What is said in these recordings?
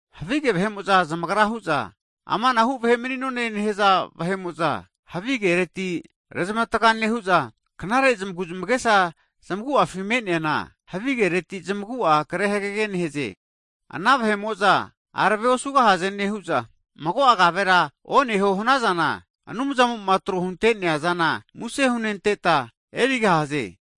Havige vahe'mo'za zamagra hu'za, amanahu vahe mani'none nehza vahe'mo'za havi kereti rezmatga nehu'za, knare zamagu zamagesa zamagu'afi me'neana, havi kereti zamagu'a kre hagege nehze. Ana vahe'mo'za arave osugahaze nehu'za, mago'a kavera oneho hanazana, tamage ke'arema tamentinti nehutma nentahimota Anumzamo'ma tro hunte'nea zana muse hunenteta susu huta erigahaze.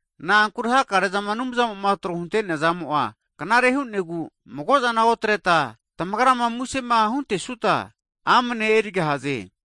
Na'ankure hakare'zama Anumzamo'ma tro hunte'nea zamo'a, knare hu'negu mago'zana otreta tamagra susu hunentetma amne erigahaze.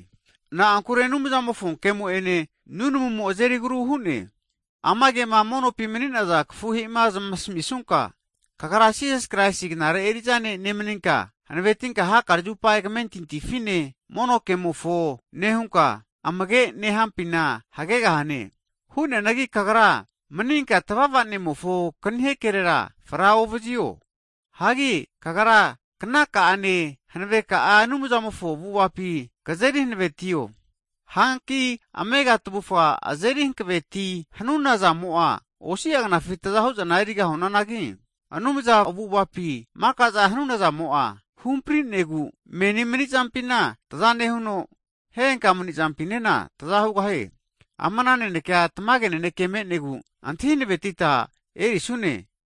Na'ankure Anumzamofo ke'mo' ene, nunamumo azeri agru hu'ne. Ama kema monopi mani'naza kafuhe'ima zamasmisunka, kagra Krais Jisasi knare eri'za ne' nemninka, hanavetinka hakare zupa kamentintifine, mono kemofo nehunka, amage'ma nentampina hagegahane. Hu'neanagi kagra maninka tvava'nemofo knihe kerera fra ovazio, hagi kagra knaka'ane, hanaveka'a Anumzamofo avu'avapi kzeri hanavetio. Hanki amega tvufa azeri hanaveti hanuna zamo'a, osi'a knafi tza hu'zana eri gahunanagi, Anumza avu'avapi (godliness) maka'za hanuna zamo'a, huhampri'negu meni mani'zampina tza nehuno, henka mani'zampinena tza hugahie. Ama nanekea tamage naneke me'negu antahi hanavetita erisnune.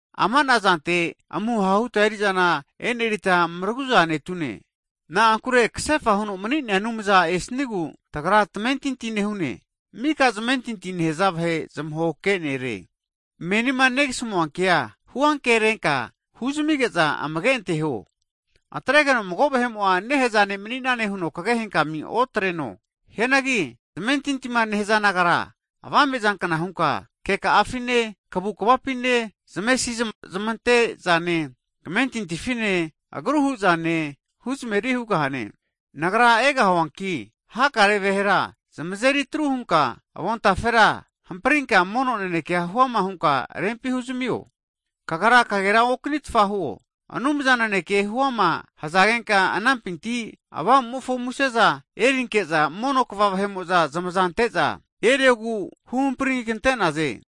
Amana zante amuho huta eri'zana enerita mragu'za netune, na'ankure kasefa huno mani'nea Anumzamo'ma esnigu tagra tamentinti nehune, mika zamentinti nehza vahe zamahokehe nere. (Savior) Menima negasmua kea huankerenka huzamige'za amage anteho. Atregeno mago vahe'mo'a nehza ne' mani'nane huno kagehenkamu otreno, hianagi zamentintima nehza nagatera avame zankna hunka keka'afine, kavu kvapine, zamesi zamante zane, kamentintifine, agru hu'zane, huzmeri hugahane. Nagra egahuanki, hakare vahera zamazeri atru hunka avontafera hamprinka mono nanekea huama hunka rempi huzamio. Kagra kagera oknitfa huo, Anumza naneke huama (profesi) hzagenka anampinti Avamu'mofo muse'za (gift) erinke'za, mono kva vahe'mo'za zamaza ante'za eri'za eriogu huhampri kante'naze.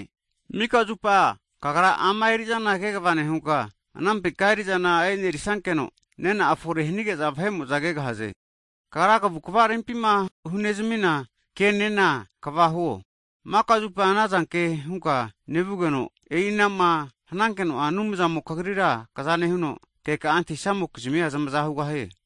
Mika zupa kagra ama erizana kegva nehunka, anampinka eri'zana enerisankeno nena'a fore hanige'za vahe'mo'za kegahze. Kagrama kavukvama nehanazana kegvanegrinka, rempima vahema hunezmina kenena kegva nehunka, maka zupa anazanke hunka nevanankeno'a, Anumzamo kagrira kagunevazino, keka'a antahinamokizmia zmagu'vazigahie.